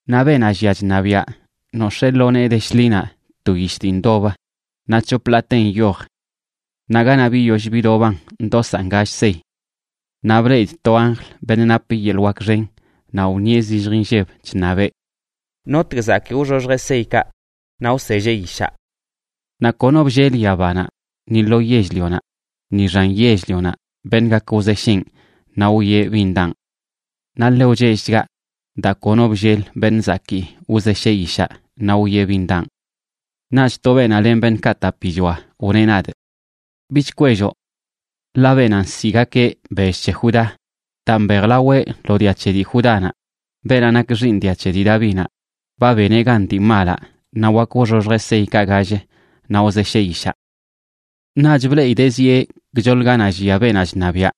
Naꞌ beenaꞌ llia chṉabiaꞌ nox̱ee lo nee de shḻinaꞌ to yish dii ndobə, naꞌ c̱hop ḻaatenꞌ nyoj. Naꞌ ganaꞌ biyoll bidoban ndosaꞌn gall sey. Naꞌ bleꞌidꞌ to anjl, beṉꞌ nap yeḻꞌ wak xen, naꞌ wṉieꞌ zillj inlleb, chṉabeꞌ: ―¿Notg zakii wxoxjeꞌ seykaꞌ naꞌ wselleꞌ yishaꞌ? Naꞌ kono bllel yabanaꞌ ni lo yell-lionaꞌ, ni xan yell-lionaꞌ, beṉꞌ gak wzesheꞌn naꞌ wwieꞌ bin daꞌn. Naꞌ ḻe wchellchgaꞌ daa kono bllel beṉꞌ zakii wzesheꞌ yishaꞌ naꞌ wwieꞌ bin daꞌn. Naꞌch to beenaꞌ len beṉꞌkaꞌ tapichoa wneꞌ nadꞌ: ―Bich kwelloꞌ, ḻaꞌ beenaꞌ nsiꞌgakeꞌ Bell c̱he Judá daa mbejlaweꞌ lo dia c̱he dii Judánaꞌ, beenaꞌ nak xiiṉ dia c̱he dii Davinaꞌ, ba beneꞌ gan dii malaꞌ naꞌ wak wxoxjeꞌ seykaꞌ gall naꞌ wzesheꞌ yishaꞌ. Naꞌch bleꞌidee zieꞌ gchoḻ ganaꞌ llia beenaꞌ chṉabiaꞌ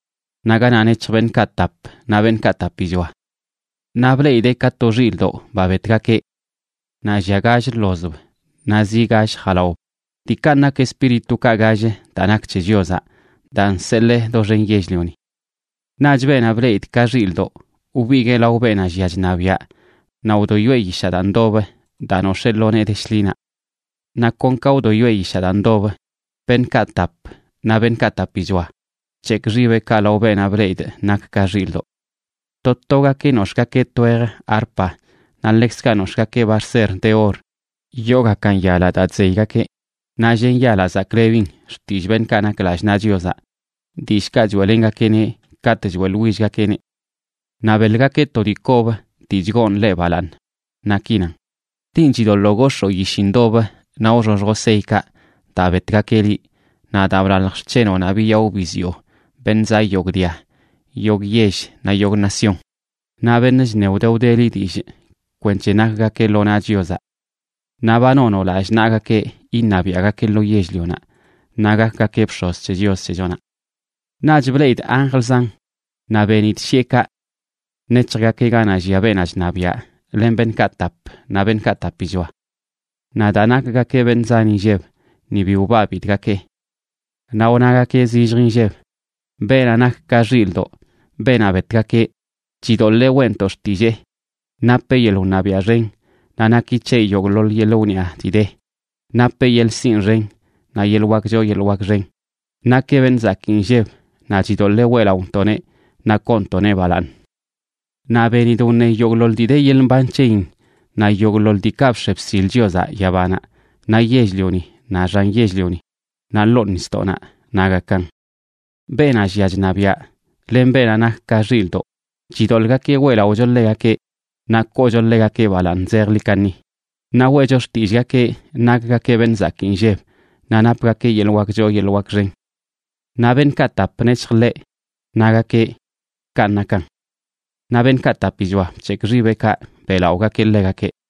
naꞌ ganaꞌ nec̱hj beṉꞌkaꞌ tap naꞌ beṉꞌkaꞌ tapichoa. Naꞌ bleꞌidee ka to xilꞌdoꞌ, ba betgakeꞌ. Naꞌ llia gall ḻozb naꞌ zi gall jalaob, diikanꞌ nak espíritukaꞌ gall daa nak c̱he Chiozaꞌ daa nseḻee doxen yell-lioni. Naꞌch beenaꞌ bleꞌidꞌ ka xilꞌdoꞌ wbiguee lao beenaꞌ llia chṉabiaꞌ naꞌ wdoyoeꞌ yishaꞌ daa ndobə daa nox̱ee lo nee de shḻinaꞌ. Naꞌ kon ka wdoyoeꞌ yishaꞌ daa ndobə, beṉꞌkaꞌ tap naꞌ beṉꞌkaꞌ tapichoa bc̱hekꞌ xibeꞌkaꞌ lao beenaꞌ bleꞌidꞌ nak ka xilꞌdoꞌ. To togakeꞌ nox̱ꞌgakeꞌ twejə arpa, naꞌ ḻekzkaꞌ nox̱ꞌgakeꞌ barser de or yoogakan yalaꞌ daa chzeygakeꞌ, naꞌ llen yalaꞌ zaklebin xtillꞌ beṉꞌkaꞌ nak lallꞌ naꞌ Chiozaꞌ, dillꞌkaꞌ choeꞌlengakeꞌneꞌ katꞌ choeꞌḻwillgakeꞌneꞌ. Naꞌ beḻgakeꞌ to dii kob dii chgoon ḻeꞌ balaaṉ, naꞌ ki nan: Linꞌ chidoḻoo gox̱oo yishi ndobə naꞌ wxoxjoꞌ seykaꞌ, daa betgakeꞌ liꞌ, naꞌ daa blalj xc̱henoꞌnaꞌ biyaꞌo biziꞌo beṉꞌ zaꞌ yogꞌ dia, yogꞌ yell naꞌ yogꞌ nación, naꞌ beṉꞌ chṉe wde wdeli dillꞌ, kwenc̱he nakgakeꞌ lo naꞌ Chiozaꞌ. Naꞌ ba nonoꞌ lallꞌ naꞌgakeꞌ iṉabiaꞌgakeꞌ lo yell-lionaꞌ naꞌ gakgakeꞌ bx̱oz c̱he Chios c̱hechonaꞌ. Naꞌch bleꞌidꞌ anjl zan, naꞌ benidꞌ shiꞌekaꞌ. Nec̱hjgakeꞌ ganaꞌ llia beenaꞌ chṉabiaꞌ len beṉꞌkaꞌ tap naꞌ beṉꞌkaꞌ tapichoa. Naꞌ daa nakgakeꞌ beṉꞌ zan inlleb ni bi wbabidꞌgakeꞌ. Naꞌ wnagakeꞌ zillj nlleb: Beenaꞌ nak ka xilꞌdoꞌ, beenaꞌ betgakeꞌ, chidoḻee weꞌntoꞌ xtillee napeꞌ yeḻꞌ wṉabiaꞌ xen, naꞌ naki c̱heꞌ yogꞌḻoḻ yeḻꞌ wniꞌa dii de, napeꞌ yeḻꞌ sinꞌ xen naꞌ yeḻꞌ wak choo yeḻꞌ wak xen, nakeꞌ beṉꞌ zakii nlleb, naꞌ chidoḻee weꞌlaꞌontoꞌneꞌ naꞌ koontoꞌneꞌ balaaṉ. Naꞌ benidꞌ wṉe yogꞌḻoḻ dii de yeḻꞌ mban c̱heyin naꞌ yogꞌḻoḻ diikaꞌ bx̱e bsil Chiozaꞌ yabanaꞌ naꞌ yell-lioni, naꞌ xan yell-lioni, naꞌ ḻoo nisdoꞌnaꞌ, nagakan: Beenaꞌ llia chṉabiaꞌ len beenaꞌ nak ka xilꞌdoꞌ, chidoḻꞌgakeꞌ weꞌlaꞌocho ḻegakeꞌ naꞌ koocho ḻegakeꞌ balaaṉ zejḻi kaṉi, naꞌ weꞌcho xtillꞌgakeꞌ nakgakeꞌ beṉꞌ zakii nlleb, naꞌ napgakeꞌ yeḻꞌ wak choo yeḻꞌ wak xen. Naꞌ beṉꞌkaꞌ tap nec̱hj ḻeꞌ, nagakeꞌ: ―¡Kanꞌ nakan! Naꞌ beṉꞌkaꞌ tapichoa bc̱hekꞌ xibeꞌkaꞌ beꞌlaꞌogakeꞌ ḻegakeꞌ.